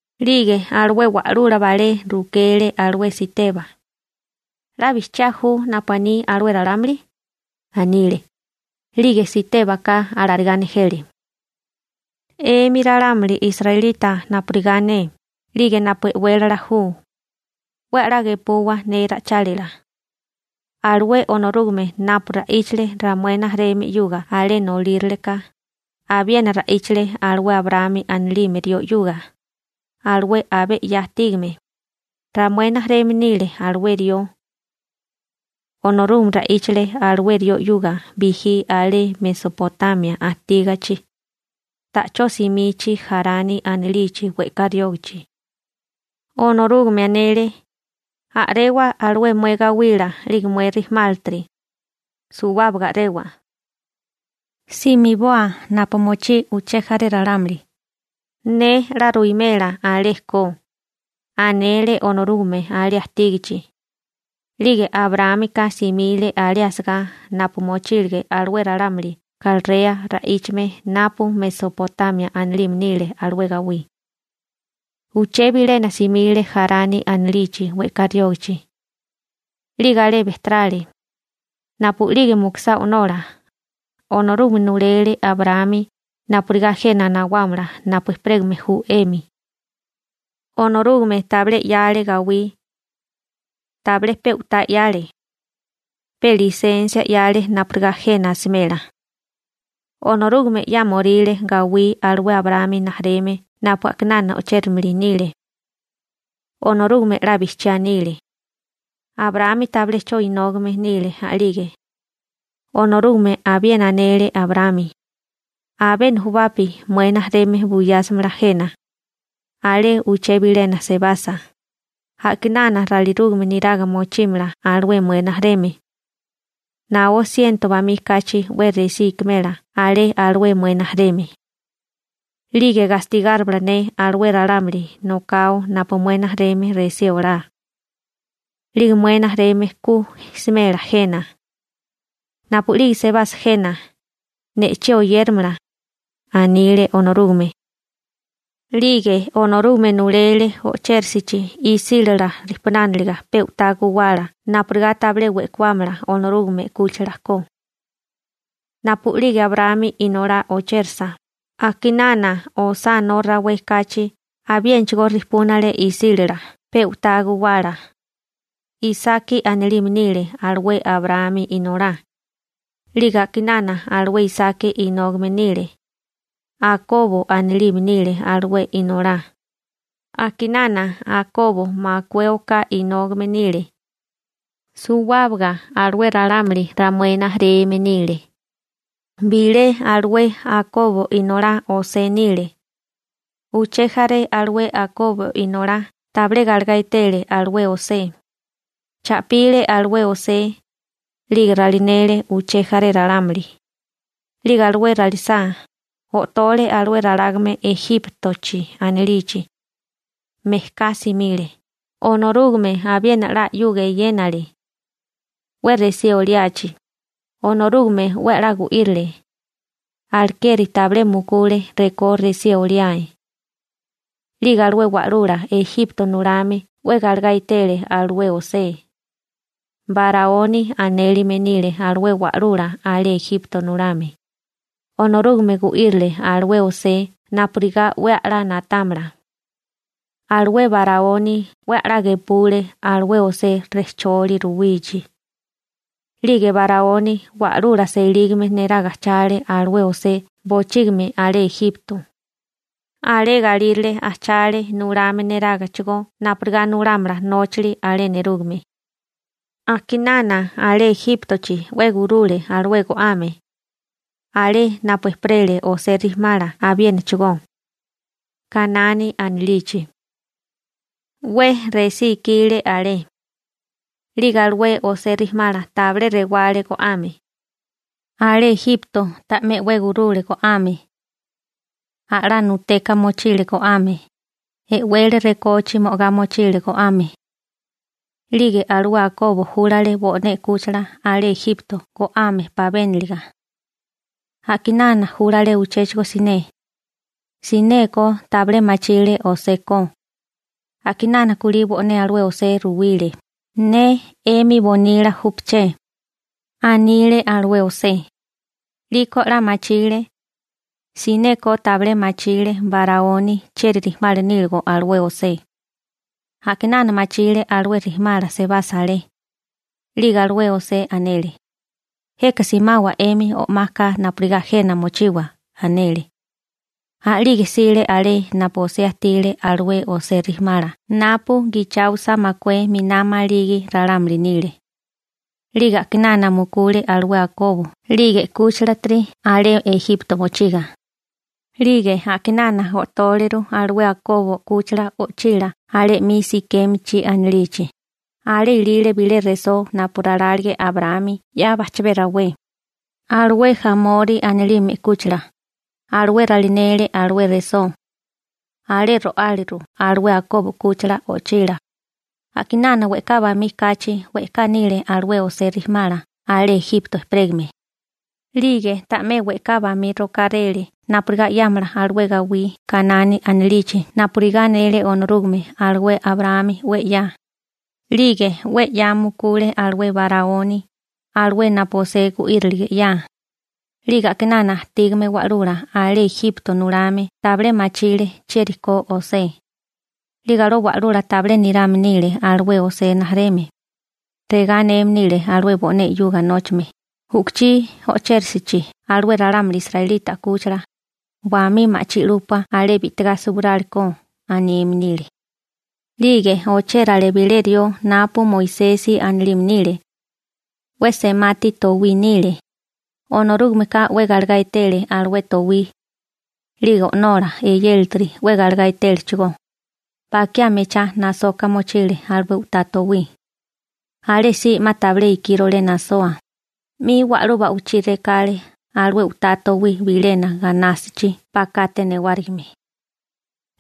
'Lige alué wa'lula balé rukele alué Siteba: ―¿'La bijchiá ju napu aní alué ralámuli? ―anile. 'Lige Sitébaka alarigá nejele: ―'Emi ralámuli israelita napurigá ne 'lige napu e'wélala ju 'we a'lá gepuwa ne ra'ichálila. Alué Onorúgame napu ra'íchale ramué rijimala 'yuga alé nolíraleka, abiena ra'íchale alué Abraámi anilime rió 'yuga, alué abé 'ya ajtígame. Ramué rijimala nile alué rió. Onorúgame ra'íchale alué rió 'yuga bijí alé Mesopotamia ajtígachi, ta'chó simichi Jarani anilichi we'ká riógachi. Onorúgame anele: «A'rewa alué mué gawila 'lige mué rijimálatiri, suwábaga a'rewa. Simiboa napu mochí uché jaré ralámuli, ne 'la ruwimela alé ko», anele Onorúgame alé ajtígichi. 'Lige Abraámika simile alé asagá napu mochílige alué ralámuli Kalrea ra'íchame napu Mesopotamia anilime nile alué gawí. Uché bilena simile Jarani anilichi we'ká riógichi. 'Lige alé bejterale. Napu'lige mukusá o'nola, Onorúgame nulele Abraámi napurigá jena nawámala napu ejperégame ju 'emi. Onorúgame tabilé 'yale gawí. Tabilé pe u'tá 'yale. Pe lisensia 'yale napurigá jena asimela. Onorúgame 'yámoríle gawí alué Abraámi rijimala napu a'kinana o'chérimili nile. Onorúgame 'la bijchiá anile. Abraámi tabilé 'cho inógame nile a'lige. Onorúgame abiena anele Abraámi: «Abé nujubapi mué rijimala buyásimala jena. Alé uché bilena sebasa (Ejipto), a'kinana ralinérigame niraga mochímala alué mué rijimala. Naó siento bamí kachi 'we resí i'kimela alé alué mué rijimala. 'Lige gastigárimala ne alué ralámuli nokao napu mué rijimala resí olá. 'Lige mué rijimala ku smela jena. Napu'lige sebasa jena, ne'chí oyéramala», anile Onorúgame. 'Lige Onorúgame nulele o'chérisichi isílala rejpunániliga pe u'tá guwala napurigá tabilé we'kuámala Onorúgame 'kúchila ko. Napu'lige Abraámi inolá o'chérasa, a'kinana osá no rawé kachi abiénachigó rejpúnale isílala pe u'tá guwala. Isaki anilime nile alué Abraámi inolá. 'Lige a'kinana alué Isaki inógame nile. Akobo anilime nile alué inolá. A'kinana Akobo makué oká inógame nile. Suwábaga alué ralámuli ramué rijimala nile. › Bilé alué Akobo inolá José nile. Uché jaré alué Akobo inolá tabilé galegá etele alué José. Cha'pile alué José, 'lige ralinele uché jaré ralámuli. 'Lige alué ralisá, o'tole alué ralágame Ejíptochi anilichi. Mejká simile, Onorúgame abiena 'la 'yuga eyénale. 'We resí oliachi, Onorúgame 'we 'la gu'írile. Alekeri tabilé mukule rekó resí oliae. 'Lige alué wa'lula Ejipto nulame 'we galegá etele alué José. Baraoni anélime nile alué wa'lula alé Ejipto nulame. Onorúgame gu'írile alué José napurigá 'we a'lá na'támala. Alué Baraoni 'we a'lá gepule alué José rejcholi ruwichi. 'Lige Baraoni wa'lula selígame neraga ajchale alué José bochígimi alé Ejipto. Alé galírale ajchale nulame nerágachigó napurigá nulámala nóchili alé nerúgame. › A'kinana alé Ejíptochi 'we gurule alué go'ame. Alé napu ejperele José rijimala abiénachigó, Kanani anilichi. 'We resí ikile alé. 'Lige alué José rijimala tabilé rewale go'ame. Alé Ejipto ta'mé 'we gurule go'ame. A'lá nuteka mochile go'ame, e'wele rekochi mo'agá muchile go'ame. 'Lige alué Akobo júlale bo'né 'kúchila alé Ejipto go'ame pabéniliga. A'kinana júlale uchéchigo siné. Sinékó tabilé machile José ko. A'kinana kulí bo'né alué José ruwile: «Ne 'emi bonila júpaché», anile alué José. 'Liko 'la machile. Sinékó tabilé machile Baraoni chieri rijimala níligo alué José. A'kinana machile alué rijimala sebasa alé. 'Lige alué José anele: «Jeka simawa 'emi o'maka napurigá jena mochiwa», anele. A'lige jsile alé napu José ajtile alué José rijimala napu gicháosa makué miná maligi ralámuli nile. 'Lige a'kinana mukule alué Akobo 'lige 'kúchilatiri alé Ejipto mochiga. 'Lige a'kinana o'tóleru alué Akobo 'kúchila o'chila alé 'mi Sikémichi anilichi. Alé ilile bilé resó napu ralálige Abraámi 'ya bajchabé rawé. Alué Jamori anilime 'kúchila, alué ralinele alué resó. Alé ro'áliru alué Akobo 'kúchila o'chila. › A'kinana we'ká bamí kachi we'ká nile alué José rijimala alé Ejipto ejperégame. 'Lige ta'mé we'ká bamí rokáréle napurigá 'yámala alué gawí Kanani anilichi napurigá anele Onorúgame alué Abraámi 'we 'ya. 'Lige 'we 'ya mukule alué Baraoni, alué napu José gu'írilige 'ya. 'Lige a'kinana ajtígame wa'lula alé Ejipto nulame tabilé machile chieri ko José. 'Lige alué wa'lula tabilé nirame nile alué José rijimala. Regá aneme nile alué bo'né 'yuga nóchame: «U'kuchí o'chéresichi alué ralámuli israelita 'kúchila, wamí ma'chí 'lúpua alé bi'tigá suwirálikó», aneme nile. 'Lige ochérale bilé rió napu Moisesi anilime nile. 'We semati towí nile. Onorúgameka 'we galegá etele alué towí. 'Lige onolá, eyélatiri 'we galegá etélechigó, bakiá mechá nasoka mochile alué u'tá towí. Alésí 'ma tabilé ikírole nasoa, 'mi wa'lú ba'wichí rekale alué u'tá towí bilena ganástachi bakate newárigime.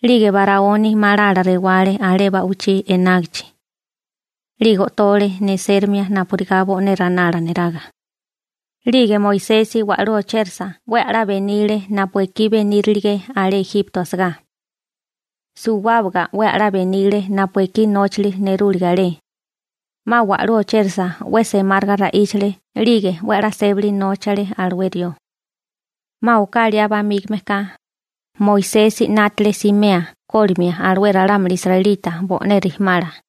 'Lige Baraoni malala rewale alé ba'wichí enágichi. 'Lige o'tole neséramia napurigá bo'né ranala neraga. 'Lige Moisesi wa'lú ochérasa 'we a'lá benile napu ekí benírilige alé Ejipto asagá. Suwábaga 'we a'lá benile napu ekí nóchali nerúlige alé. 'Ma wa'lú ochérasa 'we semáriga ra'íchale 'lige 'we a'lá sébali nóchale alué rió. › 'Ma oká liá bamígame ka, Moisesi 'nátale simea kólimia alué ralámuli israelita bo'né rijimala.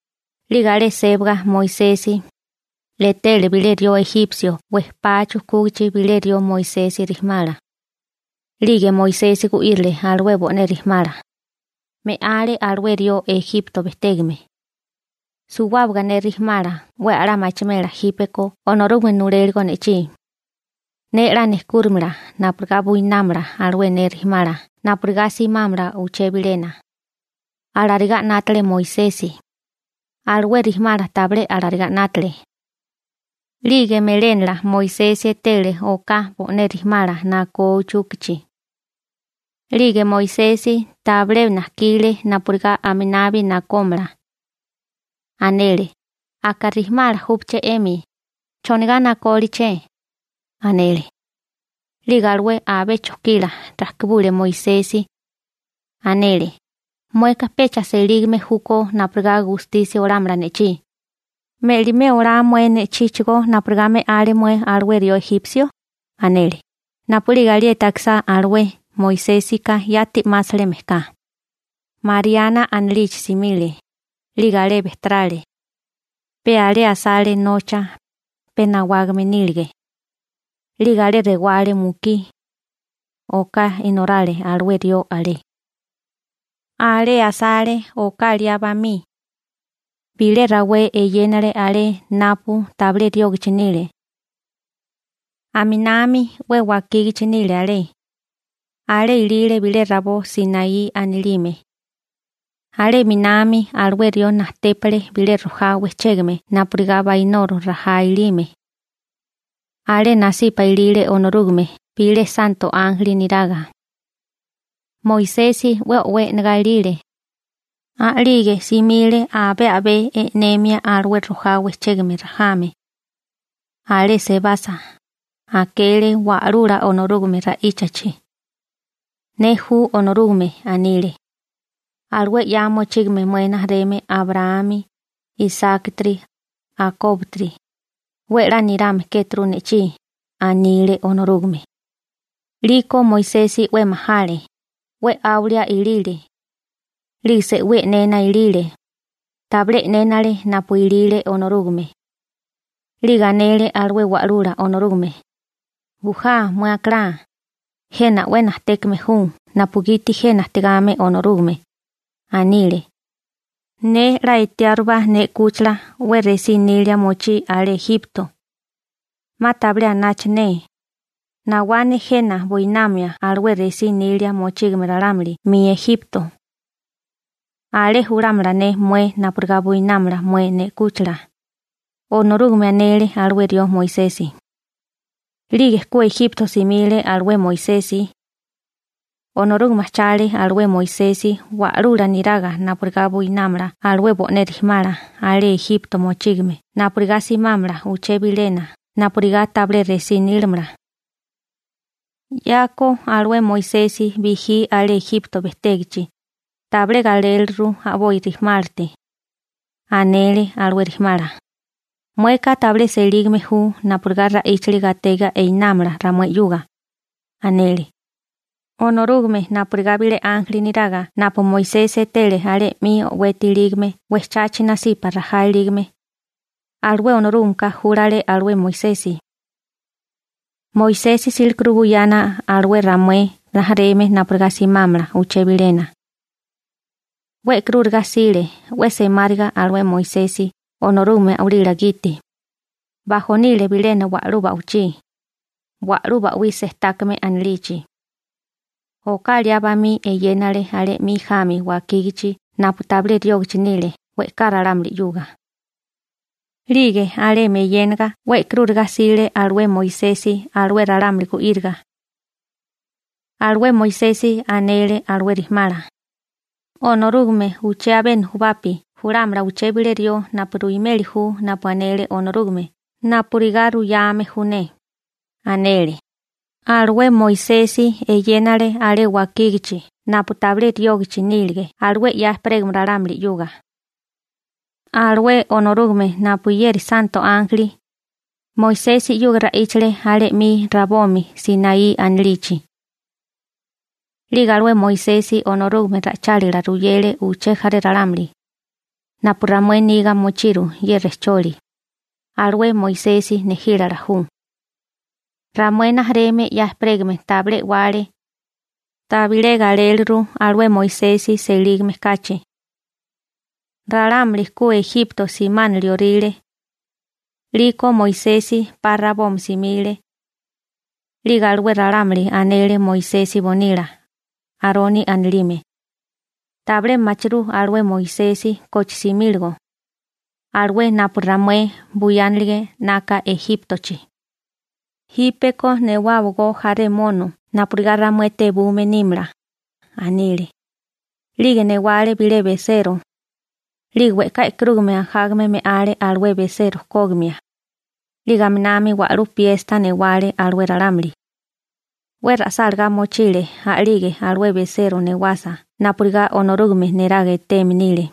'Lige alé sébaga Moisesi, etele bilé rió ejipsio wejpá chukúgachi bilé rió Moisesi rijimala. 'Lige Moisesi gu'írile alué bo'né rijimala. Me'ale alué rió Ejipto bejtégame. «Suwábaga ne rijimala 'we a'lá machimela jípeko Onorúgame nuléligo ne'chí. Ne 'la nejkúrimala napurigá buinámala alué ne rijimala napurigá simámala uché bilena.» Alarigá 'nátale Moisesi. Alué rijimala tabilé alarigá 'nátale. 'Lige melénala Moisesi etele oká bo'né rijimala nakó uchúkachi. 'Lige Moisesi tabilé najkile napurigá aminabi nakómala. Anele: «Aka rijimala júpaché 'emi, ¿chonigá nakóliché?», anele. 'Lige alué abé chojkila rajkibule Moisesi. Anele: «Mueka pecha selígame júkó napurigá gustisia olámala ne'chí. ¿Me'limé olá mué ne'chíchigó napurigá me'ale mué alué rió ejipsio?», anele. Napu'lige alieti akisá alué, Moisésika yati 'másale mejká. Mariana anilichi simile. 'Lige alé bejterale. Pe alé asale nocha, pe nawágame nílige. 'Lige alé rewale mukí. Oká inorale alué rió alé. › Alé asale oká liá bamí. Bilé rawé eyénale alé napu tabilé riógachi nile. Aminami 'we wakígachi nile alé. Alé ilile bilé rabó Sinaí anilime. Alé 'minami alué rió najtépale bilé rojá wejchégame napurigá bainoro rajá ilime. Alé nasipa ilile Onorúgame bilé santo ánjeli neraga. Moisesi 'we o'wé e'negá ilile. A'lige simile abé a'bé e'nemia alué rojá wejchégame rajame. Alé sebasa, akele Wa'lula Onorúgame ra'íchachi. «Ne ju Onorúgame», anile. «Alué 'ya mochígame mué rijimala Abraámi, Isákitiri, Akóbotiri, 'we 'la nirame kéturu ne'chí», anile Onorúgame. 'Liko Moisesi 'we majale, 'we 'áwalia ilile. 'Lige se'wí e'nena ilile, tabilé e'nénele napu ilile Onorúgame. 'Lige anele alué wa'lula Onorúgame: «Bujá mué akalá. Jena 'we najtékame ju napugiti jena ajtigame Onorúgame», anile. «Ne 'la etiárubá ne 'kúchila 'we resí nília mochí alé Ejipto. 'Ma tabilé anacha ne. Nawá ne jena buinamia alué resí nilia mochígame ralámuli 'mi Ejipto. Alé julámala ne mué napurigá buinámala mué ne 'kúchila», Onorúgame anele alué rió Moisesi. › 'Lige ku Ejipto simile alué Moisesi. Onorúgame ajchale alué Moisesi wa'lula neraga napurigá buinámala alué bo'né rijimala alé Ejipto mochígame napurigá simámala uché bilena napurigá tabilé resí nílamala. 'Yako alué Moisesi bijí alé Ejipto bejtégachi, tabilé galéliliru a'boi rijimálate. Anele alué rijimala: «Mueka tabilé selígame ju napurigá ra'íchali gatega einámala ramué 'yuga», anele. Onorúgame napurigá bilé ánjeli niraga napu Moisesi etele alé 'mi o'weti ilígame wejchachi nasipa rajá ilígame, alué Onorúgameka júlale alué Moisesi. Moisesi 'sílikuru buyana alué ramué rijimala napurigá simámala uché bilena. 'We e'karúriga 'sile 'we semáriga alué Moisesi Onorúgame a'walila gite. Bajonile bilena wa'lú ba'wichí, Wa'lú Ba'wí Sejtákame anilichi. Oká liá bamí eyénale alé 'mi jami wakígachi napu tabilé riógachi nile we'ká ralámuli 'yuga. 'Lige alemi eyénaga 'we e'karúriga 'sile alué Moisesi alué ralámuli gu'íriga. Alué Moisesi anele alué rijimala: «Onorúgame uché abé nujubapi julámala uché bilé rió napu ruimeli ju napu anele Onorúgame napurigá ruyame ju ne», anele. Alué Moisesi eyénale alé wakígachi napu tabilé riógachi nílige alué 'ya ejperégame ralámuli 'yuga. Alué Onorúgame napuyeri santo ánjeli, Moisesi 'yuga ra'íchale alé 'mi rabomi Sinaí anilichi. 'Lige alué Moisesi Onorúgame ra'ichálila ruyele uché jaré ralámuli. Napu ramué niga mochiru ye rejcholi, alué Moisesi nejílala ju. › Ramué rijimala 'ya ejperégame tabilé e'wale. Tabilé galéliru alué Moisesi selígame kachi. Ralámuli ku Ejipto simánilioríle. 'Liko Moisesi 'pa rabomi simile. 'Lige alué ralámuli anele Moisesi bonila, Aroni anilime: «Tabilé machirú alué Moisesi koche simíligo, alué napu ramué buyánilige 'naka Ejíptochi. Jípeko newáwagó jaré mono napurigá ramué tebume nímala», anile. 'Lige newale bilé besero. 'Lige we'ká e'karúgame ajágame me'ale alué besero kógimia. 'Lige aminami wa'lú piesta newale alué ralámuli. 'We ra'sálagá mochile a'lige alué besero newasa napurigá Onorúgame neraga eteme nile.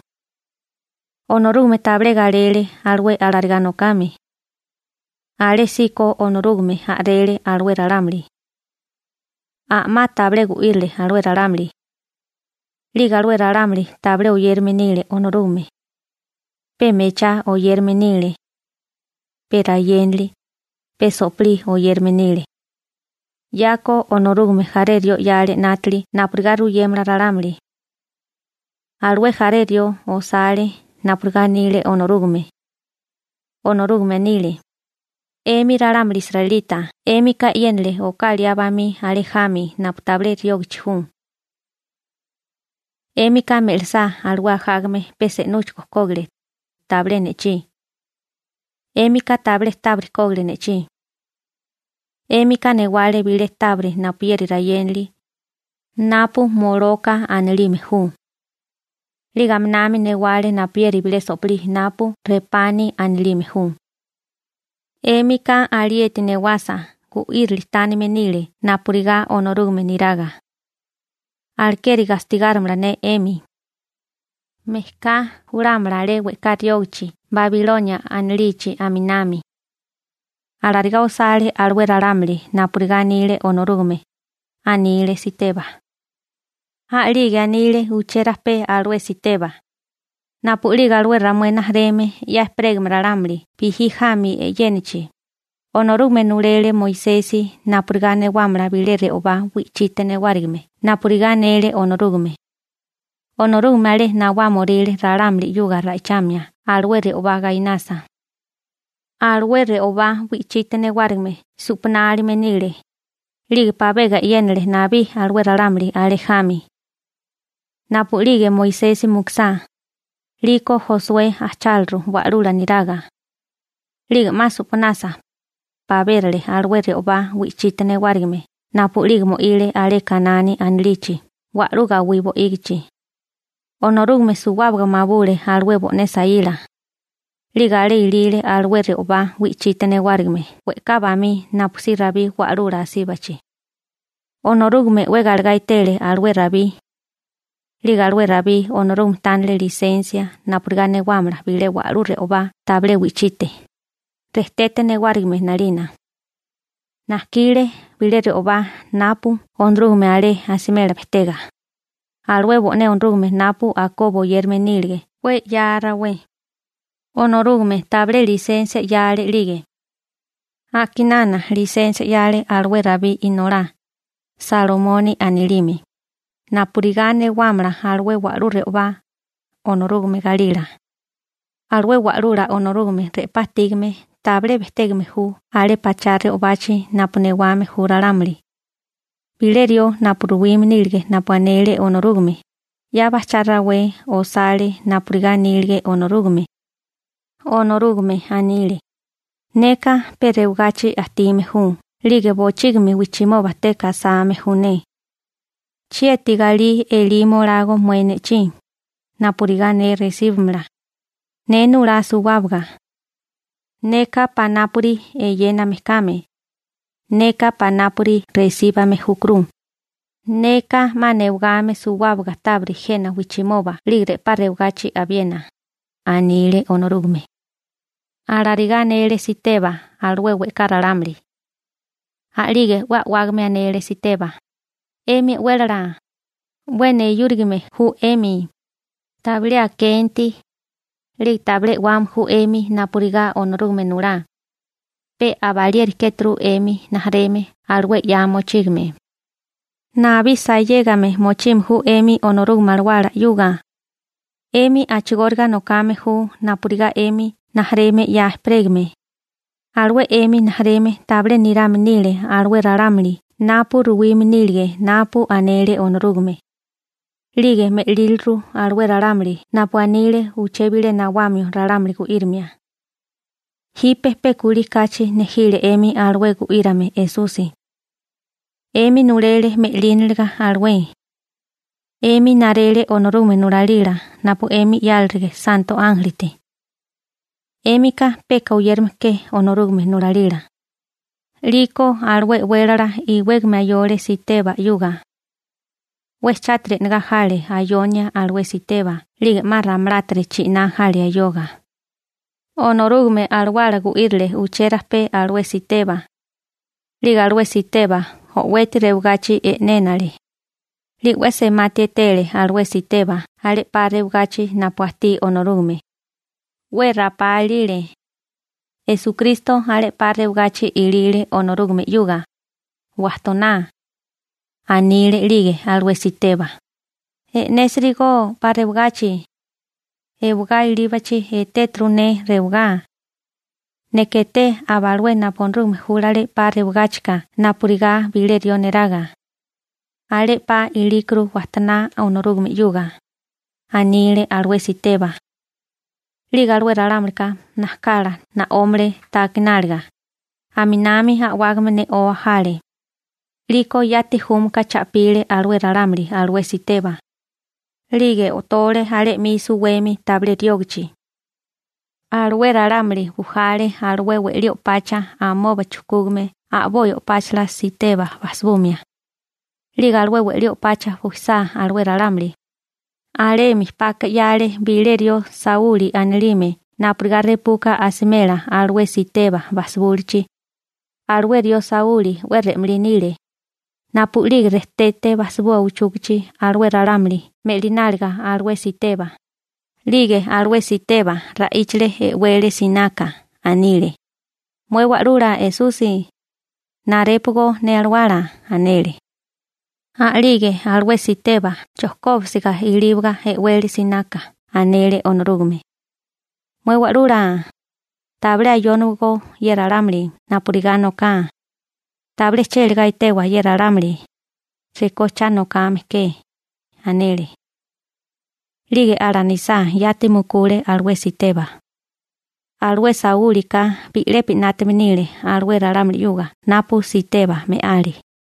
Onorúgame tabilé galele alué alarigá nokame. Alésíko Onorúgame a'rele alué ralámuli. A'má tabilé gu'írile alué ralámuli. 'Lige alué ralámuli tabilé oyérame nile Onorúgame. Pe mechá oyérame nile. Pe rayénali, pe so'pilí oyérame nile. 'Yako Onorúgame jaré rió 'yale 'nátili napurigá ruyémala ralámuli. Alué jaré rió osale napurigá anile Onorúgame. Onorúgame anile: 'Emi ralámuli israelita 'émika e'yénale oká liá bamí alé jami napu tabilé riógichi ju. 'Émika me'lisá alué ajágame pe se'núchigo kógile, tabilé ne'chí. 'Émika tabilé tábiri kógile ne'chí. 'Émika newale bilé tábiri napuyeri rayénali, napu Moloka anilime ju. 'Lige aminami newale napuyeri bilé so'pilí napu Repani anilime ju. 'Émika alieti newasa gu'írili tánime nile napurigá Onorúgame niraga. Alekeri gastigárimala ne 'emi. Mejká julámala alé we'ká riógachi Babilonia anilichi aminami. Alarigá osale alué ralámuli napurigá anile Onorúgame ―anile Siteba. A'lige anile uché rajpé alué Siteba: ―Napu'lige alué ramué rijimala 'ya ejperégame ralámuli bijí jami e'yénachi, Onorúgame nulele Moisesi napurigá newámala bilé re'obá wi'chite newárigime napurigá anele Onorúgame. Onorúgame alé nawámoríle ralámuli 'yuga ra'ichamia alué re'obá gainasa. Alué re'obá wi'chite newárigime su'panálime nile, 'lige pabega e'yénale nabí alué ralámuli alé jami. Napu'lige Moisesi mukusá, 'liko Josué ajcháleru wa'lula niraga. 'Lige 'ma su'panasa, pabérale alué re'obá wi'chite newárigime napu'lige mo'ile alé Kanani anilichi wa'lú gawí bo'ígichi. Onorúgame suwábaga mabule alué bo'né saíla. 'Lige alé ilile alué re'obá wi'chite newárigime we'ká bamí napusí Rabí wa'lula asíbachi. Onorúgame 'we galegá etele alué Rabí. 'Lige alué Rabí Onorúgame tánile lisensia napurigá newámala bilé wa'lú re'obá tabilé wi'chite, rejtete newárigime 'nalina. Najkile bilé re'obá napu Onorúgame alé asimela bejtega, alué bo'né Onorúgame napu Akobo oyérame nílege 'we 'ya rawé. Onorúgame tabilé lisensia 'yale 'lige. A'kinana lisensia 'yale alué Rabí inolá, Salomoni anilime, napurigá newámala alué wa'lú re'obá, Onorúgame galila. › Alué Wa'lula Onorúgame re'pá ajtígame tabilé bejtégame ju alé pachá re'obachi napu newame ju ralámuli. Bilé rió napu ruwime nílige napu anele Onorúgame, 'ya bajchá rawé osale napurigá anílige Onorúgame. Onorúgame anile: Neka pe rewagachi ajtime ju 'lige bochígimi wijchimoba teka asame ju ne. ¿Chieti galí elimo olago mué ne'chí, napurigá ne resíbumala? Ne nulá suwábaga. Neka panápuri eyéname kame. Neka panápuri resíbame júkuru. Neka 'ma newagame suwábaga tábiri jena wijchimoba 'lige re'pá rewagachi abiena. Alarigá anele Siteba alué we'ká ralámuli. A'lige 'we a'wágame anele Siteba: ―'Emi e'wélala, 'we neyúrigame ju 'emi, tabilé akenti, 'lige tabilé e'wame ju 'emi napurigá Onorúgame nulá. Pe abalieri kéturu 'emi rijimala alué 'ya mochígame. Nabí sayégame mochime ju 'emi Onorúgame Alawala 'yuga. 'Emi a'chigóriga nokame ju napurigá 'emi rijimala 'ya ejperégame. Alué 'emi rijimala tabilé nirame nile alué ralámuli napu ruwime nílige napu anele Onorúgame, 'lige me'líliru alué ralámuli napu anile uché bilé nawamio ralámuli gu'írimia. Jipe pe kulí kachi nejile 'emi alué gu'írame Esusi. 'Emi nulele me'línalaga alué. 'Emi narele Onorúgame nulalila napu 'emi 'yálirige santo ánjelite. ¡'Émika peka oyérame ke Onorúgame nulalila! 'Liko alué e'wélala iwégame ayole Siteba 'yuga. 'We chátiri e'negá jale ayonia alué Siteba 'lige 'ma ramalátiri chi'ná jale ayoga. Onorúgame Alawala gu'írile uché rajpé alué Siteba. 'Lige alué Siteba o'weti rewagachi e'nénale. 'Lige 'we semati etele alué Siteba alé 'pa rewagachi napu ajtí Onorúgame. 'We rapá ilile. Esukristo alé 'pa rewagachi ilile Onorúgame 'yuga, wajtoná. Anile 'lige alué Siteba: ―E'nésirigó 'pa rewagachi. Ewagá ilíbakuru rewagá. Neka eté aba alué napu Onorúgame júlale 'pa rewagáchika napurigá bilé rió neraga. Alé 'pa ilíkuru wajtoná Onorúgame 'yuga ―anile alué Siteba. 'Lige alué ralámulika najkala na'ómale ta akináliga, aminami a'wágame ne'oa jale. 'Liko yati júmaka cha'pile alué ralámuli alué Siteba. 'Lige o'tole alé 'mi suwemi tabilé riógachi. Alué ralámuli bujale alué we'lí o'pacha amoba chujkúgame a'boi o'páchala Siteba bajsibumia. 'Lige alué we'lí o'pacha bujisá alué ralámuli, alemi paka 'yale bilé rió Sauli anilime napurigá repuka asimela alué Siteba bajsibúlichi. Alué rió Sauli 'we re'malí nile. Napu'lige rejtete bajsibua uchúkachi alué ralámuli me'lináliga alué Siteba, 'lige alué Siteba ra'íchale e'wele sináká, anile: ―Mué Wa'lula Esusi, narépogo ne alawala ―anele. A'lige alué Siteba chojkóbisiga ilíbaga e'wele sináká anele Onorúgame: ―Mué Wa'lula, tabilé ayónawagó ye ralámuli napurigá noká. Tabilé chélagá etewa ye ralámuli rekó cha nokame ke ―anele. 'Lige alanisá yati mukule alué Siteba. Alué Saúlika bi'lepi 'nátame nile alué ralámuli 'yuga napu Siteba me'ale.